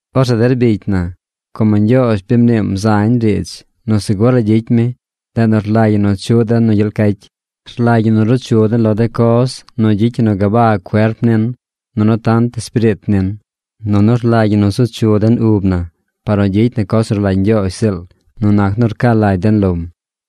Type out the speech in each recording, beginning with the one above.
Orzeꞌ der bicy na, como Ñgyoozh bi mniim zañ riidz nu segur la gyicy mi, ndeꞌ nu rlagy ñi nu chuꞌ den nu gyel cacy. Rlagy ñi nu ruu chu den lo de coz nu gyicy ñi nu gabag cuerp nin nunu tant espiriit nin. Nunu rlagy ñi nu zu chu den ub na par nu gyicy na coz nu rlagy Ñgyoozh ziꞌl nu nac nu rca lagy den lom.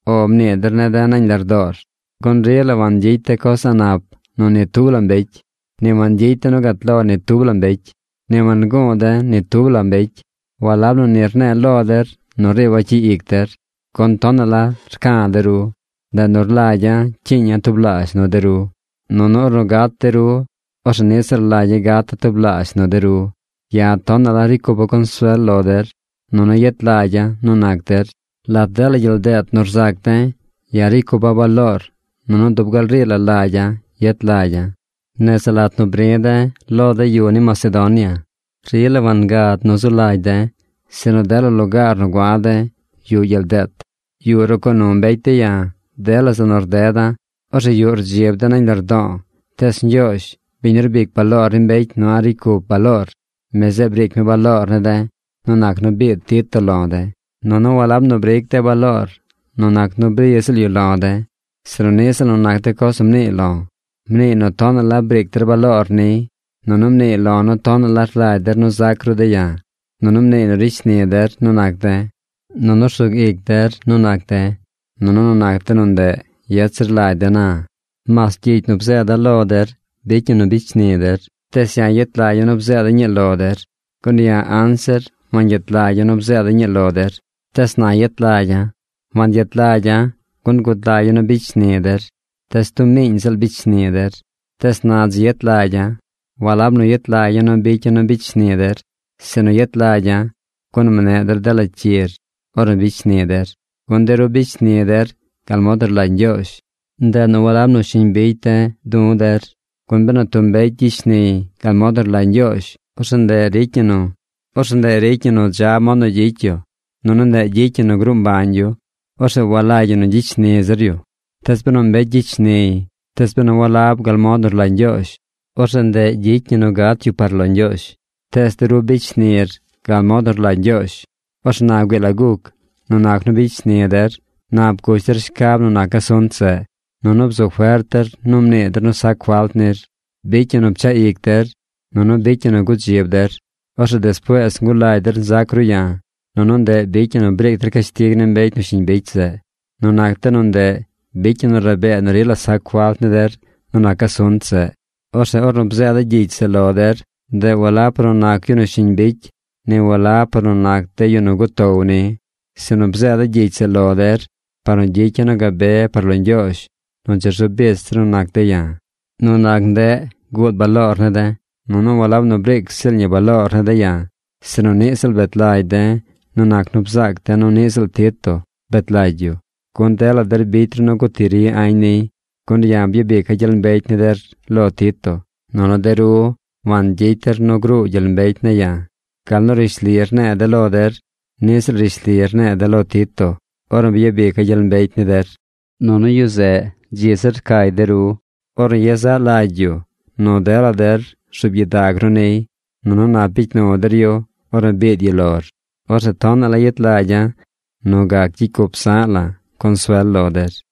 ¡“O” mnii der ne̱ de̱ nañ lardoor! Gun rila wangyicy de̱ coz a̱ꞌ nap nu ni tub la mbecy. Ni wangyicy de̱ nu gat lo ni tub la mbecy. Ni wanguu de̱ ni tub la mbecy. Walab nu ni rne̱e̱ lo der nu riiba̱ cyi ic der. Gun tonaꞌ la rca̱ de̱ ru. Ndeꞌ nu rlagya̱ cyiiña̱ tublaazh nu de ru, nunu ornu gat de ru, orzeꞌ niꞌ ziꞌl rlagya̱ gata̱ tublaazh nu de ru. Ya̱ tonaꞌ la ricy cupa̱ consuel lo der, nunu yet lagya̱ nu nac der. Lat dela gyel deet nu rzac de̱, ya̱ ricy cupa̱ baloor nunu dub gal rii la lagya̱ yet lagya̱. Nese lat nu bri̱ de̱ lo de yu ni Macedonia, rila wangad nu zu lagy de̱, sinu dela lugaar nu gua̱ de̱ yuꞌ gyel deet. Yuꞌ rucoo nu mbecy de̱ ya̱ dela zeꞌ nu rdeda̱. Orzeꞌ yuꞌ rdzib de̱ nañ lardo̱o̱. Tees Ñgyoozh, biñ nu rbic baloor ni mbecy nu a̱ꞌ ricy cup baloor, mi zeꞌ briic mi baloor ne̱ de̱ nu nac nu biid Tito lo de̱. Nunu walab nu briic de̱ baloor nu nac nu bri ziꞌl yu lo̱ de̱, sinu niꞌ ziꞌl nu nac de coz nu mniiy lo̱. Mniiy nu tonaꞌ la briic der baloor niy. Nunu mniiy lo̱ nu tonaꞌ la rlagy der nu zac ru de̱ ya̱. Nunu mniiy nu ricy shni der nu nac de̱, nunu rsug ic der nu nac de̱. Nunu nu nac de nu ndeꞌ yet zir lagy de̱ na. Mas gyicy nu bzeeda̱ lo der bicy ñi nu bicy shni der, tees ya̱ yet lagya̱ nu bzeeda̱ ñii lo der. Gun ya̱ anzir wangyet lagya̱ nu bzeeda̱ ñii lo der, tees na yet lagya̱. Wangyet lagya̱, gun gud lagya̱ nu bicy shni der. Tees tub miiñ ziꞌl bicy shni der. Tees na dzi yet lagya̱. Walab nu yet lagya̱ nu bicya̱ nu bicy shni der, sinu yet lagya̱, gun mneꞌ der dela cyir ornu bicy shni der. Gun de ru bicy shnir gal mod nu rlagy Ñgyoozh. Ndeꞌ nu walab nu shiñ bicy du̱ de̱ der. Gun benu tub mbecy gyicy shniy gal mod nu rlagy Ñgyoozh, orzeꞌ ndeꞌ ricy ñi nu dza mod nu gyicy yu. Nunu ndeꞌ gyicy ñi nu gruu mbañ yu. Orzeꞌ walagy ñi nu gyicy shni zir yu. Tees benu mbecy gyicy shniy, tees benu walab gal mod nu rlagy Ñgyoozh, orzeꞌ ndeꞌ gyicy ñi nu gat yu par lo Ñgyoozh. ¡Tees de ru bicy shnir gal mod nu rlagy Ñgyoozh! Orzeꞌ na güii la guc. Nu nac nu bicy shni der nap gush der shcab nu nac asunt zeꞌ. Nunu bzu fert der nu mnii der nu sac falt nir. Bicy ñi nu pchaꞌ ic der. Nunu bicy ñi nu gudzib der. Orzeꞌ despuees ngulagy der nzac ru ya̱. Nunu ndeꞌ bicy ñi nu briic der cashtig ni mbecy nu shiñ bicy zeꞌ. Nu nac de nu ndeꞌ bicy ñi nu rabee nu rila sac falt ni der nu nac asunt zeꞌ. Orzeꞌ ornu bzeeda̱ gyicy zeꞌ lo der, ndeꞌ walab par nu nac yu nu shiñ bicy, ni walab par nu nac de yu nu gutow ni. Sinu bzeeda̱ gyicy zeꞌ lo der par nu gyicya̱ nu gabe par lo Ñgyoozh nu dzi rzu bich der nu nac de̱ ya̱. Nu nac ndeꞌ guud baloor ne̱ de̱. Nunu walab nu briic ziꞌl ñi baloor ne̱ de̱ ya̱, sinu niꞌ ziꞌl bet lagy de̱ nu nac nu bzaac de̱ nu niꞌ ziꞌl Tito bet lagy yu, gun dela der bicy ru nu guti ri añ niy. Gun ya̱ byabica̱ gyel mbecy ni der lo Tito. Nunu de ru wangyicy der nu gruu gyel mbecy ne̱ ya̱. Gal nu rishli rne̱e̱ de̱ lo der, niꞌ ziꞌl rishli rne̱e̱ de̱ lo Tito ornu byabica̱ gyel mbecy ni der. Nunu yu zeꞌ dzi zir rcay de ru, ornu yezaꞌ lagy yu nu dela der rzuub gyidag ru niy, nunu nap bicy nu der yu ornu biid yu lor. ¡Orzeꞌ tonaꞌ la yet lagya̱ nu gac gyicy cup zaꞌ la̱ consuel lo der!